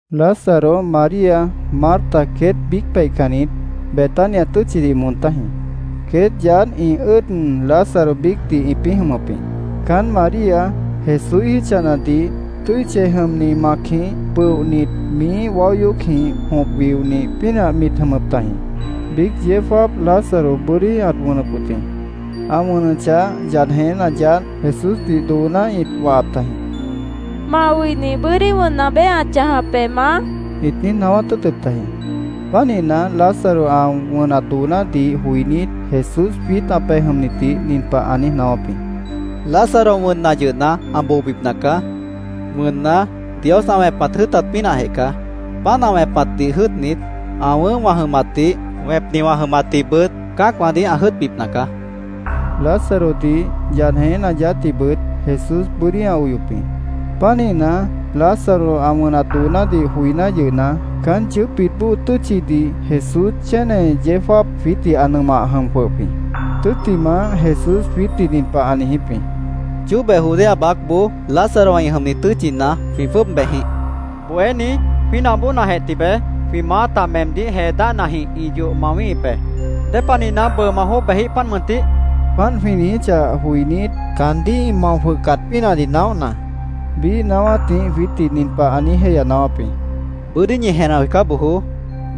Lázaro, María, Marta queét biíc peihcannit, Betania tʉ́tchidih moon tájĩ. Queét yaádh ĩ ʉ́ʉd Lázaro biícdih ĩpĩ́ jʉmʉp jĩ. Caánt María, Jesúíh jítchanadih tʉ́i chej jʉmni macjĩh pʉohnit, miíh waó yoócjĩh jõp wionih pínah mit jʉmʉp tajĩ. Biíc yeó jáap Lázaro bʉ́dí ãt wʉnʉp wʉt jĩ. Ã wʉnʉchah, yad jeñéna yaádh Jesúsdih dooná ĩt wahap tajĩ. —Ma oini bʉ́dí wʉnna beé ã chãjap be, Maá, ĩt niíj naáwát tʉ́ʉtʉp tajĩ. Pánihna, Lázaro ã wʉnat doonádih joinít, Jesús jwiít ã bohénitdih nin pah ã niíj naáwáp jĩ: —Lázaro wʉnna yʉhna, ã boobipna caá. Wʉnna, Dios ã wẽpat jʉ́ʉtat pínahjeh caá. Páant ã wẽpatdih jʉ́ʉtnit, ã wʉ̃ʉ́h wã jʉmatdih, wẽpni wã jʉmatdihbʉt cã́acwãdih ã jʉ́ʉtbipna caá, ã niijíp jĩ. Lázarodih, yad jeñéna yaádhdihbʉt Jesús bʉ́dí ã oyop jĩ. Pánihna, Lázaro ã wʉnat doonádih joiná yʉhna, caán yʉʉ́pbit bóo tʉ́tchidih Jesús chéne yeó jáap jwiítdih ã nʉmah jʉm jwʉhʉp jĩ. Tʉ́ttimah, Jesús jwiítdih nin pah ã niijíp jĩ: —Chóbe Judea baácboó, Lázarowã ĩ jʉmni tʉ́tchina, jwĩ jwʉ́ʉb bejjĩh, ã niijíp jĩ. —Bohéní, jwínah bóonajeh tibeé, jwĩ maáta meemdíh jee dáhnajĩh ĩ yoh mawíhip be. ¿Dépanihna bʉʉ ma jwʉ́ʉb bejíh, páant mʉntih? jwĩ niijíp jĩ. Páant jwĩ niijíchah joinít, caandíh ĩ mao jwʉhcat pínahdih naóhna, biíh naáwátjĩh jwiítdih nin pah ã niíj jéihya naáwáp jĩ: —Bʉ́dí ñi jenah joicá bojoó.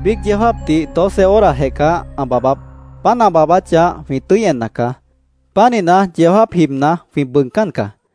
Biíc yeó jáapdih doce horajeh caá ã baabáp. Páant ã baabáchah, jwĩ tʉ́i enna caá. Pánihna, yeó jáap jibna, jwĩ bʉʉgcán caá.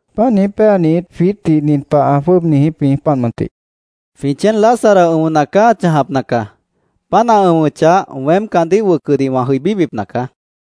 Páant niíj péanit, jwiítdih nin pah ã jwʉ́ʉb niijíp jĩ, páant mʉntih: —Jwĩ chéen Lázaro, ʉ̃ona caá an chãjapna caá. Páant ã ʉ̃wʉchah, weém caandíh wʉcʉdih wã jʉibíbipna caá, jwiítdih ã niijíp jĩ.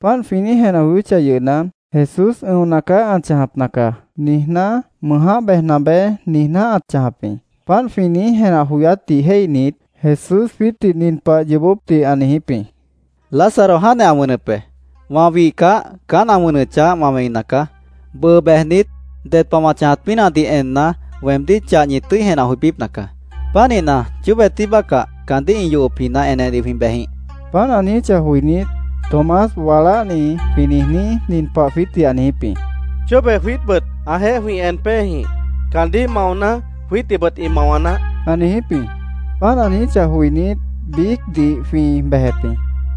Páant jwĩ niíj jenah joyóchah yʉhna, Jesús “Ʉ̃ona caá an chãjapna caá”, niijná “Mʉʉjáh bejna beé”, niijná ãt chãjap jĩ. Páant jwĩ niíj jenah joyátdih jéihnit, Jesús jwiítdih nin pah yoobópdih ã niijíp jĩ: —Lázaro jáantjeh ã wʉnʉp be. Wã wihcah, caán ã wʉnʉchah, wã wẽina caá. Bʉʉ bejnit, ded pah wã chãjat pínahdih enna, weemdíh chah ñi tʉ́i jenah joibípna caá. Pánihna, chóbe tí bácah, caandíh ĩ yohopjina enedih jwĩ bejjĩh, ã niijíp jĩ. Páant ã niijíchah joinít, Tomás, waláhni jwĩ niijní, nin pah jwiítdih ã niijíp jĩ: —Chóbe jwiítbʉt ãjeéh jwĩ en péejĩh. Caandíh maona, jwiítdihbʉt ĩ mawa naáh, ã niijíp jĩ. Páant ã niijíchah joinít, biícdih jwĩ bejep jĩ.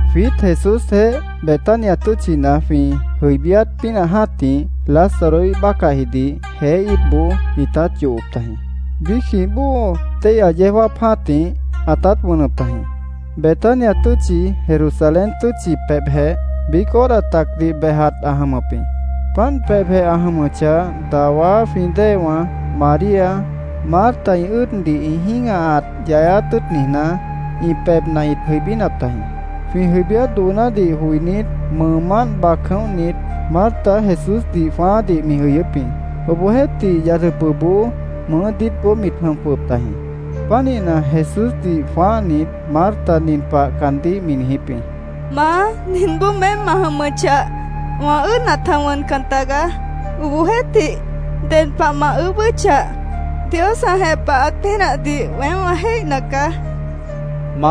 Jwiít Jesúsjeéh Betania tʉ́tchina jwĩ jʉibíát pínah jã́tih, Lázaroíh bácahjidih jeé íitboó ĩtát yohop tajĩ. Biícjĩh bóo téihya yeó jáap jã́tih ãtát wʉnʉp tajĩ. Betania tʉ́tchi Jerusalén tʉ́tchi pebhjeh, biíc hora tacdih bejat ã jʉmʉp jĩ. Páant pebhjeh ã jʉmʉchah, dawá jwĩ déewã María, Marta ĩ ʉ́ʉddih ĩ jĩ́gahat yayáát tʉ́ʉt niijná, ĩ pebhna ĩt jʉibínap tajĩ. Jwĩ jʉibíát doonádih joinít, mʉʉmánt bac jʉ̃óhnit, Marta Jesúsdih jwãáádih mi jʉyʉ́p jĩ. Obohjeéhtih, yad jʉpʉ mʉʉ́ diítboó mit jʉm jwʉhʉp tajĩ. Pánihna, Jesúsdih jwãáhnit, Marta nin pah caandíh mi niijíp jĩ: —Maá, ninboó meém ma jʉmʉchah, wã ʉ́ʉd ãta wʉncan tagaá. Obohjeéhtih, ded pah ma ʉʉ́bʉ́chah, Dios ã jepahat pínahdih weém wã jéihna caá, mi niijíp jĩ.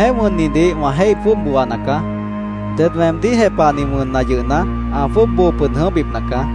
—Weemjéh wʉnnidih wã jéih jwʉ́ʉb booana caá. Ded weemdíh jepahni wʉnna yʉhna, ã jwʉ́ʉb boo pʉd jʉ̃óhbipna caá.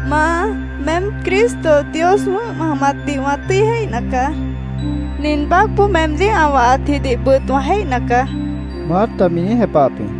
—Maá, meém Cristo Dios wʉ̃ʉ́h ma jʉmatdih wã tʉ́i jéihna caá. Nin baácboó meemdíh ã wahatjidihbʉt wã jéihna caá, Marta mi niíj jepahap jĩ.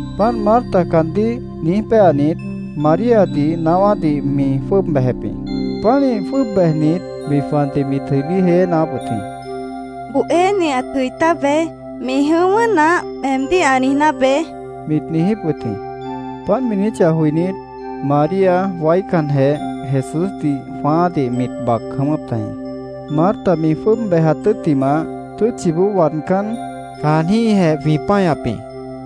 Páant Marta caandíh niíj péanit, Maríadih naáwádih mi jwʉ́ʉb bejep jĩ. Pánih jwʉ́ʉb bejnit, mi jwandih mit jʉibí jéyé naáwáp wʉt jĩ. —Bohéni ãt jʉi tábeé. ‘Mi jʉ̃ʉ́wʉ́ naáh’, meemdíh ã niijná beé, mit niijíp wʉt jĩ. Páant mi niijíchah joinít, María waícanjeh Jesúsdih jwãáádih mit bac jʉ̃ʉ́wʉ́p tajĩ. Marta mi jwʉ́ʉb bejat tʉ́ttimah, tʉ́tchiboó waadcán, caanjĩ́hjeh jwĩ páñap jĩ.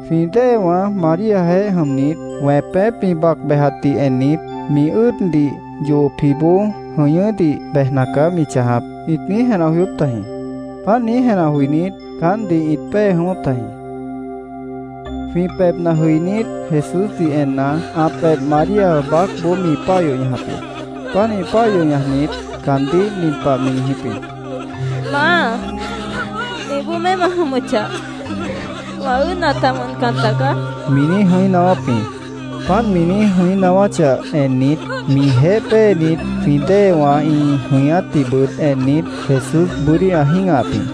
Jwĩ déewã, Maríajeéh jʉmnit, wẽpép mi bac bejatdih ennit, “Mi ʉ́ʉddih yohopjiboó jʉñʉ́dih bejna caá mi chãjap”, ĩt niíj jenah joyóp tajĩ. Páant niíj jenah joinít, caántdih ĩt pée jʉ̃ʉ́wʉ́p tajĩ. Jwĩ pebhna jʉinít, Jesúsdih enna, ã pebh María baácboó mi páah yoh ñajap jĩ. Pánih páah yoh ñajnit, caandíh nin pah mi niijíp jĩ: —Maá, ninboó meém ma jʉmʉchah, wã ʉ́ʉd ãta wʉncan tagaá, mi niíj jʉ̃í naáwáp jĩ. Páant mi jʉ̃í naáwáchah ennit, mijeéh péenit jwĩ déewã ĩ jʉñátdihbʉt ennit, Jesús bʉ́dí ã jĩ́gahap jĩ.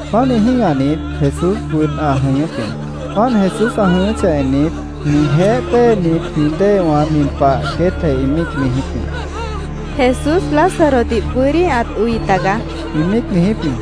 Pánih jĩ́gahnit, Jesúsbʉt ã jʉñʉ́p jĩ. Páant Jesús ã jʉñʉ́chah ennit, mijeéh péenit jwĩ déewã nin pah queétjeh ĩ míic niijíp jĩ: —Jesús Lázarodih bʉ́dí ãt oi tagaá, ĩ míic niijíp jĩ.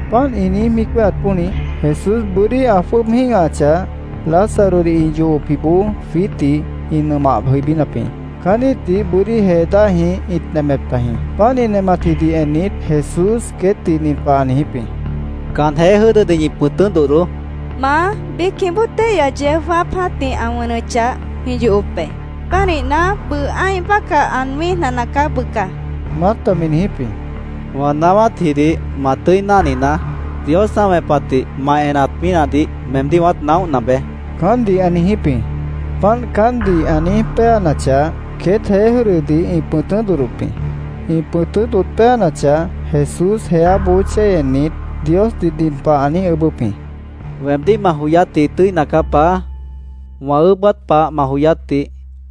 Páant ĩ niíj míic wéheat pónih, Jesús bʉ́dí ã jwʉ́ʉb jĩ́gahachah, Lázarodih ĩ yohopjiboó jwiítdih ĩ nʉmah jʉibínap jĩ. Caán íitdih bʉ́dí jee dáhjĩh ĩt nemep tajĩ. Páant ĩ nematjidih ennit, Jesús queétdih nin pah ã niijíp jĩ: —Can jeé jʉ́dʉdih ñi pʉ̃tʉ́ dodhdoó, ã niijíp jĩ. —Maá, biícjĩh bóo téihya yeó jáap jã́tih ã wʉnʉchah, jwĩ yohop be. Pánihna, bʉʉ ã́ih bácah an wĩ́ijna nacaá bʉca, Marta mi niijíp jĩ. —Wã naáwátjidih ma tʉ́i náhninaá. Dios ã wẽpatdih ma enat pínahdih meemdíh wãát naóhna beé, caántdih ã niijíp jĩ. Páant caántdih ã niíj péanachah, queét jeé jʉ́dʉdih ĩ pʉ̃tʉ́ dodhdop jĩ. Ĩ pʉ̃tʉ́ dodh péanachah, Jesús jeáboó chéi ennit, Diosdih nin pah ã niíj ʉʉ́bʉ́p jĩ: —Weemdíh ma joyátji tʉ́ina caá, Paá. Wã ʉʉ́bát pah ma joyátdih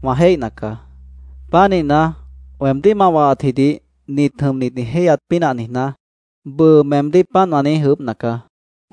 wã jéihna caá. Pánihna, weemdíh ma wahatjidih nit jʉmnit ĩ jéihyat pínah niijná, bʉʉ meemdíh páant wã niíj ʉʉ́bhna caá, Jesús ã niijíp jĩ.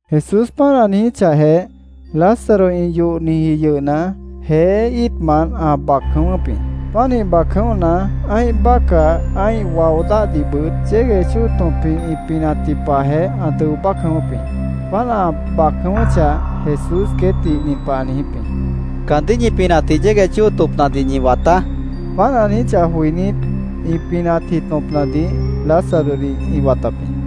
Jesús páant ã niíj ejechahjeh, Lázaro ĩ yohniji yʉhna, jeé íitmant ã bac jʉ̃ʉ́wʉ́p jĩ. Pánih bac jʉ̃óhna, ã́ih bácah, ã́ih wao dáhdihbʉt yégueh chóo tõpjĩh ĩ pinatji pahjeh ã dʉo bác jʉ̃ʉ́wʉ́p jĩ. Páant ã bac jʉ̃ʉ́wʉ́chah, Jesús queétdih nin pah ã niijíp jĩ: —Caandíh ñi pinatji yégueh chóo tõpnadih ñi wataá, ã niijíp jĩ. Páant ã niijíchah joinít, ĩ pinatji tõpnadih Lázarodih ĩ watap jĩ.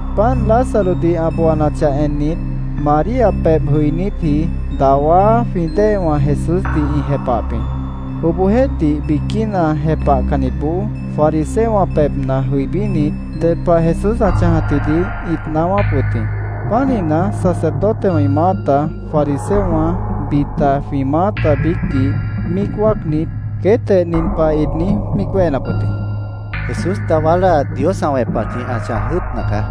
Páant Lázarodih ã booanachah ennit, María pebh jʉinítji dawá jwĩ déewã, Jesúsdih ĩ jepahap jĩ. Obohjeéhtih, biquína jepahcannitboó fariseowã pebhna jʉibínit, ded pah Jesús ã chãjatjidih ĩt naáwáp wʉt jĩ. Pánihna, sacerdotewã ĩ maáta, fariseowã, bita jwĩ maáta biícdih míic wáacnit, queétjeh nin pah ĩt niíj míic wéhenap wʉt jĩ: —Jesús dawá láa Dios ã wẽpatjĩh ã chãj jʉ́ʉtna caá.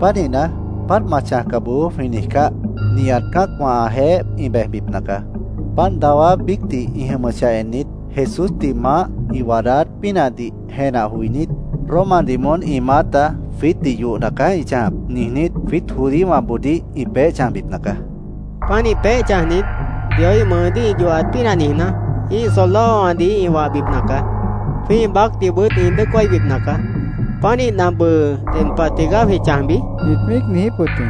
Pánihna, ‘Páant ma chãjca bojoó’, jwĩ niijcáh, nihat cã́acwã ãjeéh ĩ bejbipna caá. Páant dawá biícdih ĩ jʉmʉchah ennit, Jesúsdih maáh ĩ waadáát pínahdih jenah joinít, Romadih moón ĩ maáta ‘Jwiítdih yohna caá ĩ chãjap’, niijnít, jwiít judíowãboodíh ĩ peéh chãjbipna caá. Pánih peéh chãjnit, Dioíh mʉʉdíh ĩ yohat pínah niijná, ĩ́ih soldadowãdih ĩ wahbipna caá. Jwĩ́ih baácdihbʉt ĩ dʉ́ʉc wáibipna caá. Pánihna, ¿bʉʉ ded pah tigaá jwĩ chãjbi? ĩt míic niijíp wʉt jĩ.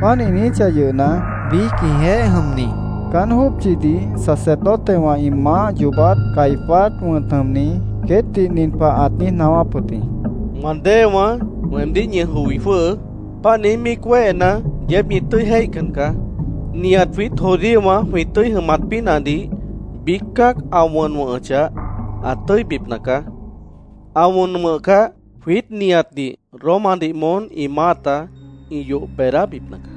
Páant ĩ niijíchah yʉhna, biíc ĩjeéh jʉmni, caán jópchidih sacerdotewã ĩ maáh yoobát Caifás wʉ̃t jʉmni, queétdih nin pah ãt niíj naáwáp wʉt jĩ: —Wã déewãá, weemdíh ñi joi jwʉ́hʉʉ́. Páant niíj míic wéhena, yeéb ñi tʉ́i jéihcan caá. Nihat jwiít judíowã jwĩ tʉ́i jʉmat pínahdih biíc cã́ac ã wʉn wʉ̃hʉchah, ã tʉ́ibipna caá. Ã wʉn wʉ̃hcah, jwiít nihatdih Romadih moón ĩ maáta ĩ yoh beedábipna caá.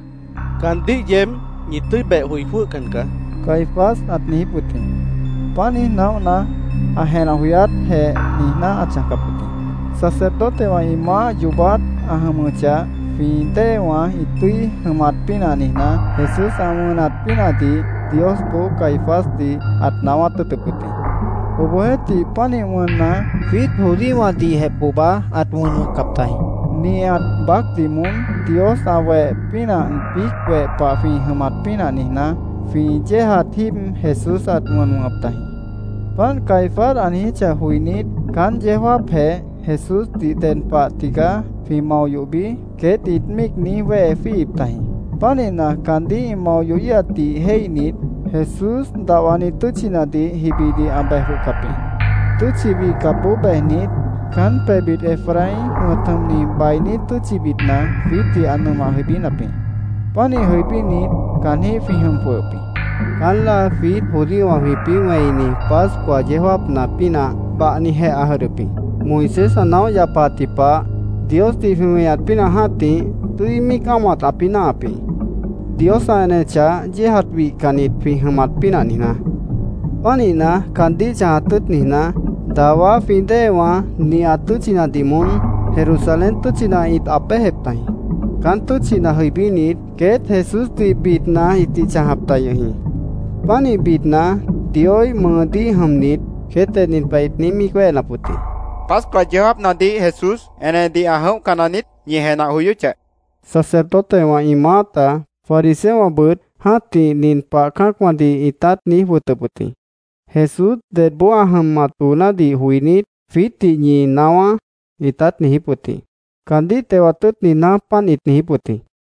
Caandíh yeéb ñi tʉ́i beh joi jwʉ́hcan caá, Caifás ãt niijíp wʉt jĩ. Páant niíj naóhna, ã jenah joyátjeh niijná ãt chãjcap wʉt jĩ. Sacerdotewã ĩ maáh yoobát ã jʉmʉchah, jwĩ déewã ĩ tʉ́i jʉmat pínah niijná, Jesús ã wʉn wʉ̃hat pínahdih Diosboó Caifásdih ãt naáwát tʉ́ʉtʉp wʉt jĩ. Obohjeéhtih, pánih wʉnna, jwiít judíowãdihjeh pohba ãt wʉn wʉ̃hcap tajĩ. Nihat baácdih moón Dios ã weh pínah biíc weh pah jwĩ jʉmat pínah niijná, jwĩ yéejat jíib Jesús ãt wʉn wʉ̃hʉp tajĩ. Páant Caifás ã niijíchah joinít, caán yeó jáapjeh “¿Jesúsdih ded pah tigaá jwĩ mao yohbi?” queét ĩt niíj míic wéhe jwíihip tajĩ. Pánihna, caandíh ĩ mao yohíhatdih jéihnit, Jesús dahwani tʉ́tchinadih jibidih ã bejíhcap jĩ. Tʉ́tchi wihcapboó bejnit, caán pebhbit Efraín wʉ̃t jʉmni bainí tʉ́tchibitna jwiítdih ã nʉmah jʉibínap jĩ. Pánih jʉibínit, caanjĩ́h jwĩ jʉm jwʉhʉp jĩ. Caán láa jwiít judíowã jwĩpĩ́ wẽini Pascua yeó jáapna pínah bahnijeh ã jʉdhdʉp jĩ. Moisés ã naóh yapaatji pah, Diosdih jwĩ weñat pínah jã́tih tʉ́i míic ámohat ãpĩ́ náahap jĩ, Dios ã enechah, yéejat wihcannit jwĩ jʉmat pínah niijná. Pánihna, caandíh chãjat tʉ́ʉt niijná, dawá jwĩ déewã nihat tʉ́tchinadih moón Jerusalén tʉ́tchina ĩt aab béjep tajĩ. Caán tʉ́tchina jʉibínit, queét Jesúsdih bidna ĩtih chãjap ta yʉh jĩ. Pánih bidna, Dioíh mʉʉdíh jʉmnit, queétjeh nin pah ĩt niíj míic wéhenap wʉt jĩ: —¿Pascua yeó jáapnadih Jesús enedih ã jʉ̃óhca naniít? ñi jenah joyóchah, ĩt niijíp wʉt jĩ. Sacerdotewã ĩ maáta, fariseowãbʉt jã́tih nin pah cã́acwãdih ĩtát niíj wʉtʉp wʉt jĩ: “Jesús dedboó ã jʉmat doonádih joinít, jwiítdih ñi naáwá”, ĩtát niijíp wʉt jĩ. Caandíh tewat tʉ́ʉt niijná, páant ĩt niijíp wʉt jĩ.